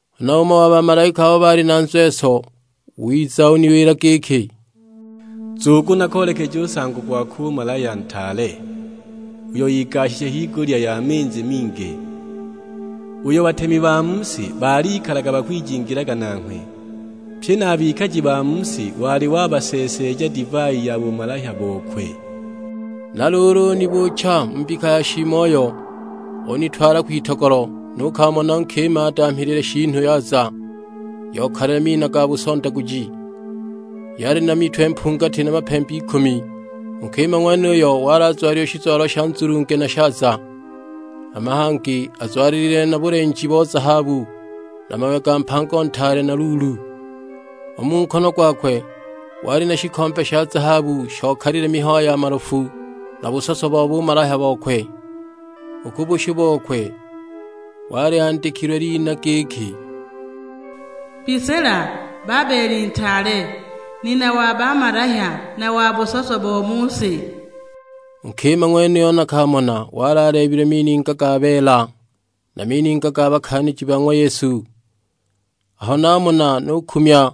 Huna umo wa bamalaika abo baali na nzweso wiza, uniwila giki, "Nzugu nakoolekeje u nsango gokwe u malahya ntaale, uyo igashije higulya ya minzi mingi; uyo batemi ba mu si balikalaga bakwijingilaga nanghwe, pye na a bikaji ba mu si wali wabaseeseeja divai ya bumalahya bokwe." Na luulu unibuucha mu mbika ya shiimoyo, unitwala kwitogolo; nukamona nkima adamhilile shiinu yaza yokalile mina ga busondaguji; yali na mitwe mpungati na mapembe ikumi. U nkima ng'wenuyo wali azwalile shizwalo sha nzulunge na shaaza, hama hangi azwalilile na bulenji bo zahabu na mawe ga mpango ntaale na luulu. U mu nkono gwakwe wali na shikombe sha zahabu shokalile mihayo ya malofu na busoso bo bumalahya bokwe. U ku bushu bokwe wali andikilwe lina; giki, MBISILA, BABELI NTAALE, NINA WA BAMALAHYA, NA WA BUSOSO BO MU SI. U nkima ng'wenuyo nakamona wali aleebilwe mininga ga beela, na mininga ga bakaaniji ba ng'wa Yesu. Aho namona nukumya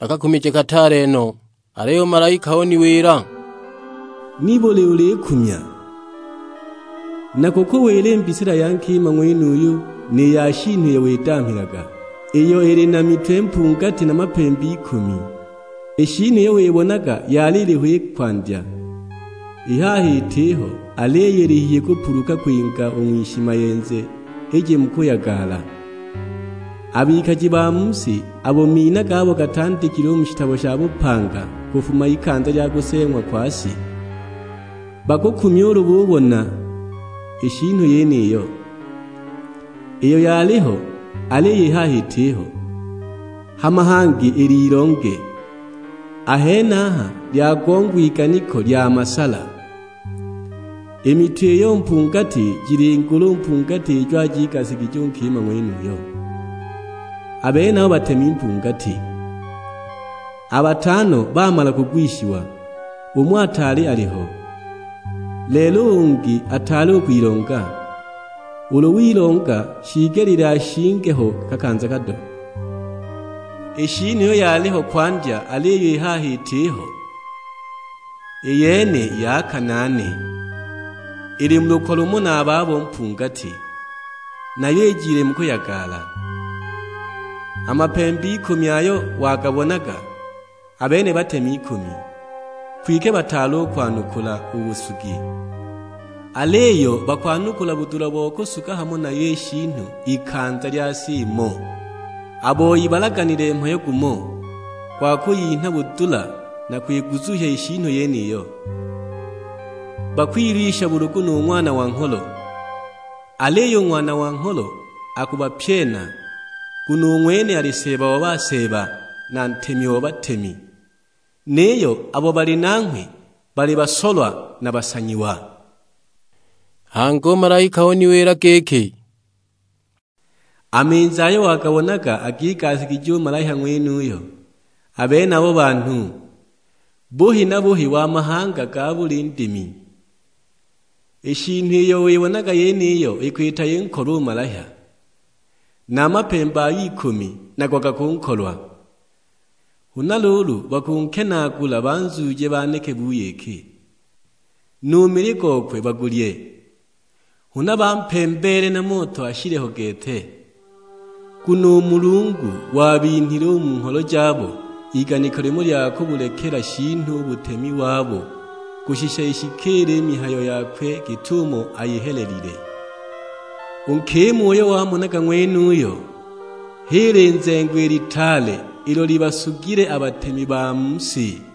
na kakumije kataale no! Aliyo u malaika uniwila, "Nibuli ulikumya? Nakukuwila i mbisila ya nkima ng'wenuyu ni ya shiinu iyo widamhilaga, iyo ili na mitwe mpungati na mapembe ikumi. I shiinu iyo wibonaga yali iliho i kwandya, i haha itiho, aliyo ili hihi kupuluka kwinga u ng'wishimayenze ije mu kuyagala. A bikaji ba mu si, abo mina gabo gatandikilwe mu shitabo sha bupanga kufuma ikanza lya kuseeng'wa kwa si, bakukumya ulu bibona i shiinu yeniyo, iyo yaliho, aliyo i haha itiho, hama hangi ililonge. A henaha lyagongwa iganiko lya masala; i mitwe iyo mpungati jili ngulu mpungati ijo ajigasigije u nkima ng'wenuyo, a benabo batemi mpungati. A batano bamala kugwishiwa, umo ataali aliho, lelo u ungi ataali u kwilonga, ulu wilonga shiigelile ashinge ho kakanza kado. I shiinu iyo yaliho kwandya aliyo i haha itiho, i yene ya kanaane, ili mu lukwa lumo na a babo mpungati, nayo ijile mu kuyagala. A mapembe ikumi ayo wagabonaga, a bene batemi ikumi; kwike bataali u kwanukula u busugi. Aliyo bakwanukula budula bo kusuga hamo nayo i shiinu ikanza lya sa imo. A boi balaganile mhayo gumo, gwa kuyinha budula na kwiguzuhya i shiinu yeniyo. Bakwilwisha bulugu nu Ng'wana wa Ngholo; aliyo u Ng'wana wa Ngholo akubapyena, nguno u ng'wene ali Seeba wa baseeba na Ntemi wa batemi, niyo abo bali nanghwe bali basolwa na basanyiwa." Hangi u malaika uniwila giki, "A minzi ayo wagabonaga agigasigije u malahya ng'wenuyo, a benabo banhu; buhi na buhi wa mahanga ga buli ndimi. I shiinu iyo wibonaga yeniyo ikwita inkolwe u malahya. Na a mapembe ayo ikumi nago gakunkolwa; huna luulu bakunkenaagula banzuuje baneke buyiki, nu mili gokwe bagulye; huna bampembeele na moto ashile ho gete! Nguno u Mulungu wabinhile u mu ngholo jabo iganiko limo lya kubulekela shiinu u butemi wabo kushisha ishikiile i mihayo yakwe git'umo ayihelelile. U nkima uyo wamonaga ng'wenuyo, h'i linzengo i litaale ilo libasugile a batemi ba mu si!"